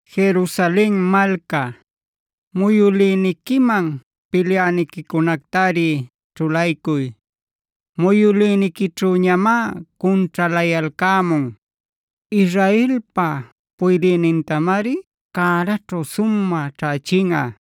Jerusalen malca, muyülïniquiman pilyäniquicunactari ćhulaycuy. Muyülïniquićhüñamá cunćhaläcayalcämun. Israelpa puydïnintamari cäraćhu sumä ćhächinꞌa.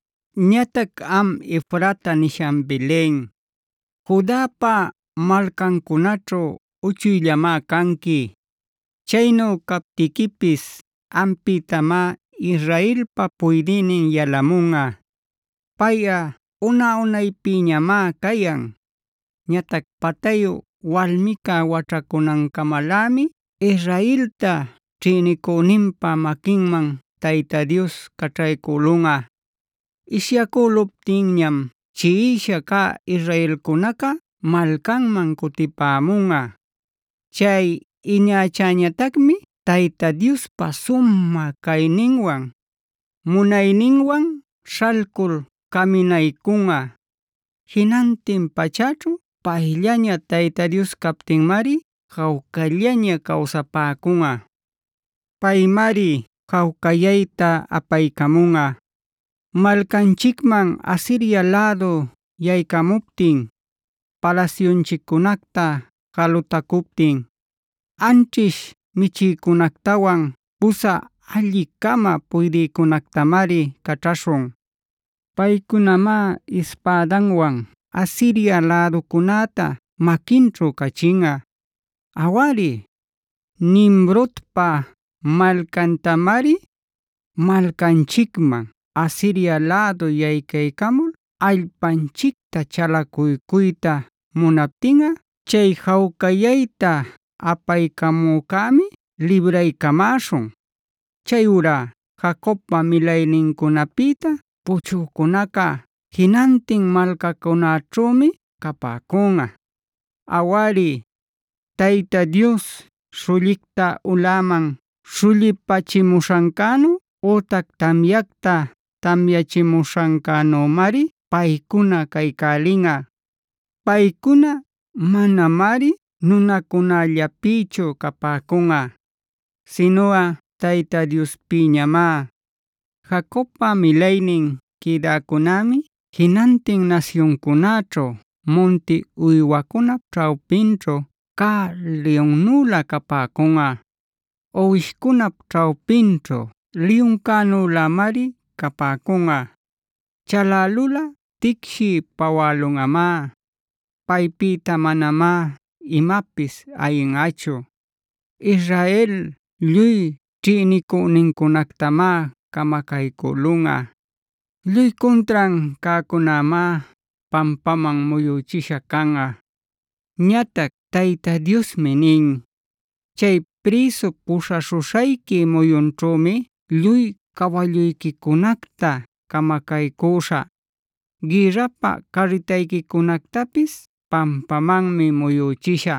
Ñatac am Efrata nishan Belen,a Judapa malcancunaćhu uchuyllanmá canqui. Chaynu captiquipis ampïtamá Israelpa puydïnin yalamunꞌa. Payꞌa una-unaypïñamá cayan. Ñatac patayu walmica waćhacunancamalämi Israelta ćhïnicüninpa maquinman Tayta Dios caćhaycülunꞌa. Ishyacüluptinñam chiꞌisha cä israelcunaca malcanman cutipämunꞌa. Chay iñachäñatacmi Tayta Diospa sumä cayninwan, munayninwan śhalcul caminaycunꞌa. Jinantin pachäćhu payllaña Tayta captinmari jawcallaña cawsapäcunꞌa. Paymari jawcayayta apaycamunꞌa. Malcanchicman Asiria lädu yaycamuptin, palasyunchiccunacta jalutacuptin, anćhish michïcunactawan pusä alli-cama puydïcunactamari caćhaśhun. Paycunamá ispädanwan Asiria läducunäta maquinćhu cachinꞌa, awari, Nimrodpab malcantamari. Malcanchicman Asiria lädu yaycaycamul allpanchicta chalacuycuyta munaptinꞌa chay jawcayayta apaycamücämi libraycamäśhun. Chayurá Jacobpa milaynincunapïta puchücunaca jinantin malcacunäćhümi capäcunꞌa. Awari, Tayta Dios śhullicta ulaman śhullipächimuśhancänu ütac tamyacta tamyachimuśhancänümari paycuna caycälinꞌa. Paycuna manañamari nunacunällapïchu capäcunꞌa, sinuꞌa Tayta Diospïñamá. Jacobpa milaynin quïdäcunämi jinantin nasyuncunäćhu munti uywacunap ćhawpinćhu cä liyunnülä capäcunꞌa; uwishcunap ćhawpinćhu liyuncänülämari capäcunꞌa. Chalälulꞌa ticshiy pawälunꞌamá; paypïta manamá imapis ayinꞌachu. Israel lluy ćhïnicünincunactamá camacaycülunꞌa; lluy cuntran cäcunämá pampaman muyüchisha canꞌa. Ñatac Tayta Diosmi nin: “Chay prïsu puśhaśhuśhayqui muyunćhümi lluy cawalluyquicunacta camacaycüśhä; gïrrapä carritayquicunactapis pampamanmi muyüchishä.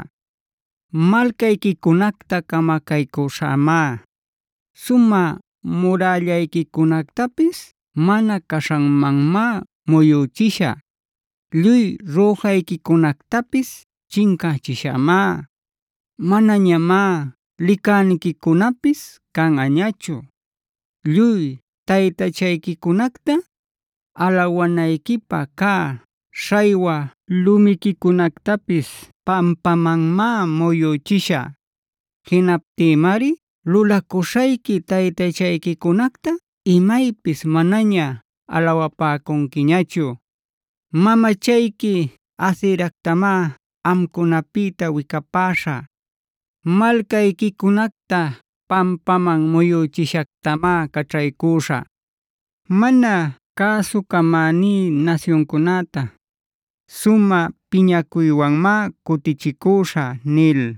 Malcayquicunacta camacaycüśhämá; sumä murällayquicunactapis mana caśhanmanmá muyüchishä. Lluy rüjayquicunactapis chincächishämá; manañamá licacüniquicunapis canꞌañachu. Lluy taytachayquicunacta, alawanayquipä cä śhaywa lumiquicunactapis pampamanmá muyüchishä. Jinaptïmari lulacuśhayqui taytachayquicunacta imaypis manaña alawapäcunquiñachu. Mamachayqui Aseractamá amcunapïta wicapäśhä; malcayquicunacta pampaman muyüchishactamá caćhaycüśhä. Mana cäsucamäní nasyuncunäta, sumä piñacuywanmá cutichicüśhä” nil.